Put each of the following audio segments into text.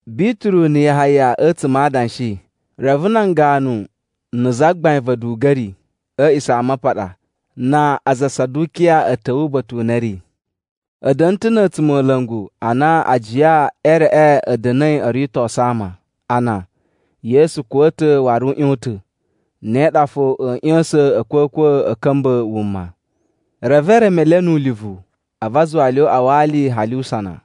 Bituru na̱ Yahaya a̱tsuma̱ a adanshi, reve nan ganu na̱ zagbain va̱ a̱duga̱ri a̱ A̱a̱ꞌisamapaɗa na aza a Sadukiya a̱ ta̱wa̱ uba̱ta̱ u na a̱ ri. A̱ da̱na̱ ta̱ na̱ a̱tsumola̱ngu a na ajiya e reꞌe a̱ da̱na̱i o ritosu ama a na, Yesu kuwa̱ ta̱ waru u ꞌyon ta̱. Ne ɗa fo a̱a̱ ꞌya̱sa̱n a̱kwa̱kwa̱ a̱ ka̱mba̱ wuma. Reve e reme le nu ulivu, a̱vu a zuwa le o uꞌwa wa ali hali usana.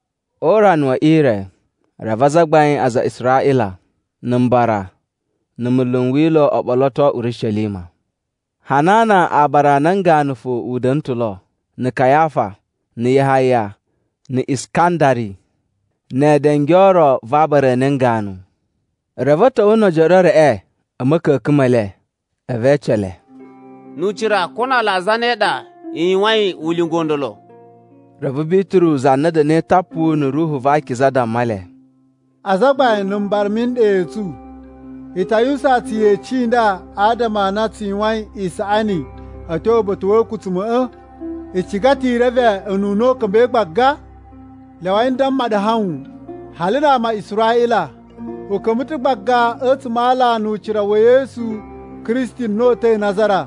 O urana we ire, reve azagbain a aza a Israꞌila, na̱ mbara, na̱ munlu n Wila̱ o ɓoloto Urishelima. Hanana aabara a nan ganu fo u da̱na̱ ta̱ lo, na̱ Kayafa, na̱ Yahaya na̱ Iskandari ne edenge o ro va aabara a nan ganu. Reve a̱ ta̱wa̱ no ojoro e reꞌe a̱ ma̱ka̱ka̱n me le. A̱vu e ece le, “Nu ucira ko na ala a zane ɗa i yuwayin ulinga u ndolo?” Reve Bituru za na da̱na̱i tapu na̱ Ruhu va Akiza, damma le, “Azagbain na̱ mbara mi iɗa i tsu, i ta yuwusan tsu yeci i nda adama a na tsu yuwain isaꞌani a̱ tyo uba̱ta̱ wa̱ a̱a̱kutsuma̱ꞌa̱? I ciga ta̱ i reve ununa u ka̱mba̱i gbaga? Lyawai n damma ɗu hawun hali na ama a Israꞌila, u ka̱mba̱ ta̱ gbaga a̱tsuma̱ a ala nu ucira wa̱ Yesu Kristi na uta̱i Nazara.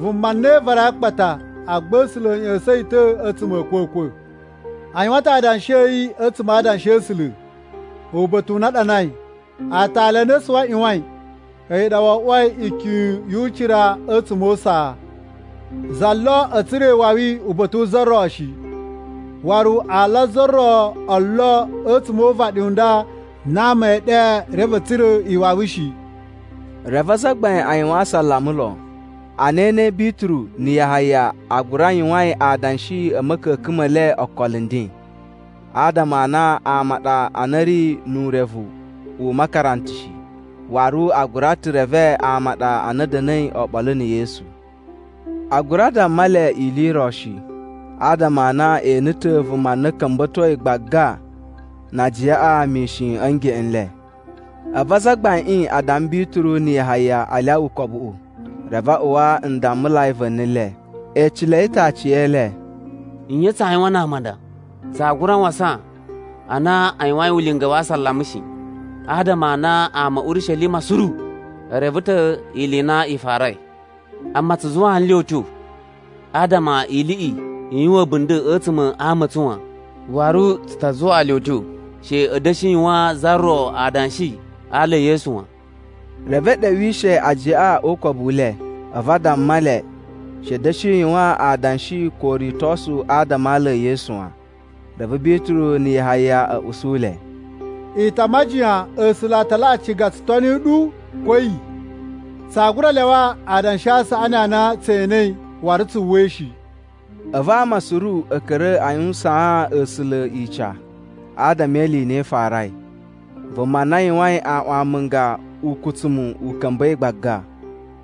Vuma na i varai a akpata, agba A̱sula̱ a̱ ꞌya̱sa̱n yi ta̱ a̱tsuma̱ a̱ a̱kwa̱kwa̱. A yuwan ta̱ adanshi a̱ yi a̱tsuma̱ a Adanshi a̱ A̱sula̱, uba̱ta̱ u na a ɗanai, ‘Aatali a na asuwi a ꞌyuwain, a̱yi ɗa wo oꞌwoi ikyun yu ucira a̱tsuma̱ o usaa.’ “Za lo a̱ tsura̱ iwawi uba̱ta̱ wu za ro shi! Waru ala a za ro o lo a̱tsuma̱ o uvaɗi u nda na ama ee ɗe reve a̱ tsura̱ iwawi shi.” Reve azagbain a yuwan asalama lon, ana e enei Bituru na̱ Yahaya a gura yuwain adanshi a̱ ma̱ka̱ka̱n me le okolo nden, adama a na ama a ɗa a na a̱ ri nu urevu u makaranta shi. Waru a gura ta̱ reve ama a ɗa a na a̱ da̱na̱i oɓolo na̱ Yesu. A gura damma le ili i ro shi, adama a na e ene ta̱ vuma na a̱ ka̱mba̱toi gbaga na ajiyaꞌa mishin a̱ ngeꞌen n le. A̱vu azagbaiꞌin a damma Bituru na̱ Yahaya a lyawa ukobuꞌu. Reve a uwa ndammulai va̱ni le. E ecelei ta̱ aciyele, “Nye tsaa yuwan na ama a nda? Tsaa gura wasan a na a yuwain ulinga wa asalama shi. Adama a na ama a̱ Urishelima suru e reve ta̱ ili i na i farai. Amma tsu zuwaa nle utyo adama iliꞌi i yuwan a̱bunda̱ a̱tsuma̱ a ama a̱ tsu wan. Waru tsu ta zuwaa le utyo she a̱ da̱shi yuwaan za ro adanshi a ala e Yesu wan.” Reve e ɗewishe ajiyaꞌa o ukobu u le, a̱vu a damma le she a̱ da̱shi yuwan adanshi ko uritosu adama a ala e Yesu wan. Reve Bituru na̱ Yahaya a̱ usu le, “I ta majiyan A̱sula̱ a ta laꞌa ciga tsu toni ɗu ko a̱yi? Tsaa gura lyawa adanshi a saꞌani a na tse enei waru tsu uwwai shi.” A̱vu ama suru a̱ ka̱ra̱ a yuwusaan A̱sula̱ ica adama e ili i na i farai: Vuma na yuwain aꞌwan amunga ukutsumu u ka̱mba̱i gbaga.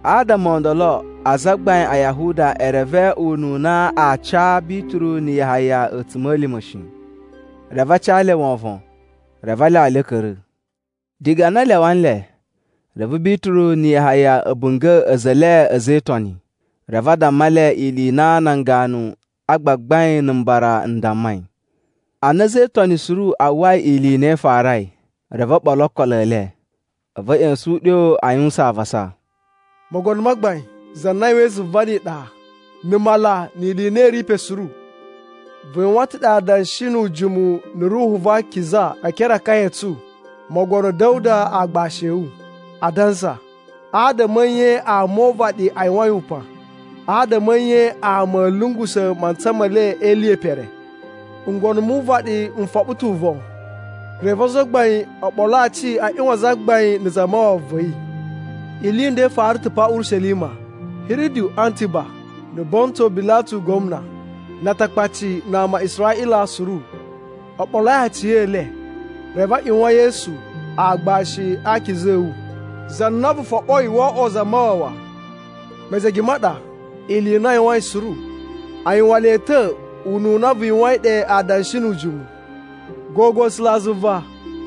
Adama o ndolo azagbain a Yahuda e reve ununa aa ca Bituru na̱ Yahaya a̱tsuma̱lima̱ shi. Reve a ca le wovon, reve a lyawa le a̱ ka̱ra̱. Diga na a lyawa nle, reve Bituru na̱ Yahaya a̱ bunga̱ a̱za̱ e le a̱za̱ e Itoni, reve a damma le ili i na nan ganu a gbagbain na̱ mbara n dammai. Ana a̱za̱ e Itoni suru a uwwai ili i na i farai, reve o ɓolo okolo e le. A̱vu a̱ ꞌya̱sa̱n uɗyo a yuwusan avasa, “Mogono ma Gbain, za na yuwain zuva ni iɗa, na̱ mala ni ili i na i ri pe suru. Vu yuwan ta̱ ɗe adanshi nu ujimu na̱ Ruhu va Akiza e ekere a akaya a̱ tsu mogono Da̱wuda agbashi a̱ wu, adansa, ‘Adama a̱ nye ama o uvaɗi a yuwain upan? Adama a̱ nye ama a̱a̱ lungusa̱ mantsa me le e ili ye pere? Ngono mu uvaɗi n foɓo ta̱ uvon, reve azagbain o ɓolo aci a ꞌyuwan Zagbain na̱ Zamawawa va̱ yi.’ “Ili i nda i fara ta̱ pa Urishelima. Hiridu Antiba, na̱ Bontu Bilatu gwamna, na Atakpaci na ama a Israꞌila suru o ɓoloi aci e le, reve a ꞌyuwan Yesu, aagbashi a akiza a̱ wu, za na vu foɓoi wo oꞌwo Zamawawa. Mejege ma ɗa, ili i na a yuwain suru, a yuwan le ta̱ ununa vu yuwain ɗe adanshi nu ujimu. Gogo A̱sulazuva,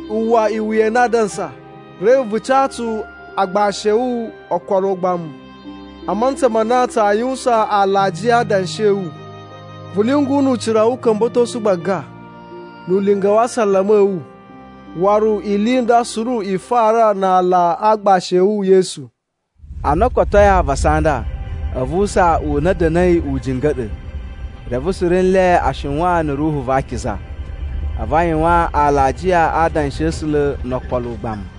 uwwa iwuya i na a dansa, reve vu ca tsu agbashi a̱ wu okolo o ugbamu a mantsa ma na tsaa yuwusan alajiya a adanshi a̱ wu. Vu lyungu nu ucira wu uka̱mba̱tosu gbaga, nu ulinga wa asalama a̱ wu, waru ili i nda suru i fara na ala a aagbashi a̱ wu Yesu.” Ana o kotoi avasa a nda, a̱vu usaa u na a̱ da̱na̱i u jinga̱ɗa̱, reve suru nle a shiwan na̱ Ruhu va Akiza. A̱vu a yuwan alajiya a adanshi a̱ A̱sula̱ no okolo ugbamu.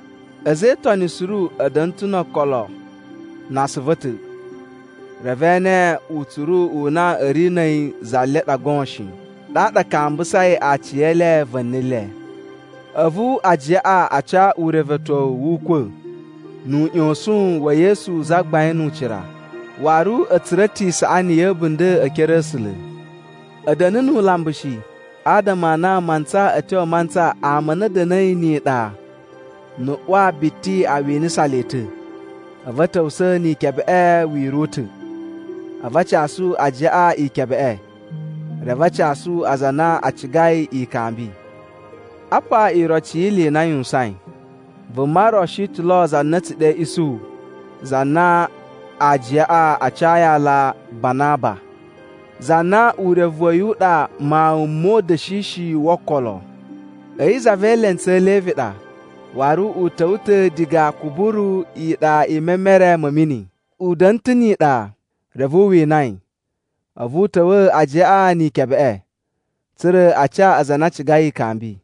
A̱za̱ e Itoni suru a̱ da̱na̱ ta̱ no okolo na asuvu a̱ ta̱, reve e ene utsuru u na a̱ ri na̱ a̱yi za le ɗa goon shi, ɗaɗa a kambusai aciyele va̱ni le. A̱vu ajiyaꞌa a ca urevetyowu wu ukwa̱ nu uꞌyosun wa̱ Yesu Zagbain nu ucira, waru a̱ tsura̱ ta̱ isaꞌani ya̱ a̱bunda̱ e ekere a̱ A̱sula̱. A̱ da̱na̱ nu ulambu shi, adama a na mantsa a̱ tyo mantsa ama a na a̱ da̱na̱i ni iɗa na̱ ꞌwa biti a winasa le ta̱, a̱vu a̱ ta̱wusa̱a̱ ni ikebeꞌe wira̱ u ta̱. A̱vu a casu ajiyaꞌa ikebeꞌe reve a casu aza a na a cigai ikambi. Apa iroci yi ili i na a yuwusain, vuma ro shi ta̱ lo za na a̱ tsu ɗe Isuhu za na ajiyaꞌa a cayi aala Banaba (za na urevu wa̱ yi u ɗa Mawun mo Uda̱shishi wo Okolo). A̱yi za ve elentsu e Levi a ɗa, waru u ta̱wa̱ ta̱ diga Kuburu iɗa i memere ma̱ mini. U da̱na̱ ta̱ ni iɗa, reve u wina yi, a̱vu u ta̱wa̱a̱ ajiyaꞌa ni ikebeꞌe, tsa̱ra̱ a ca aza a na a cigai ikambi.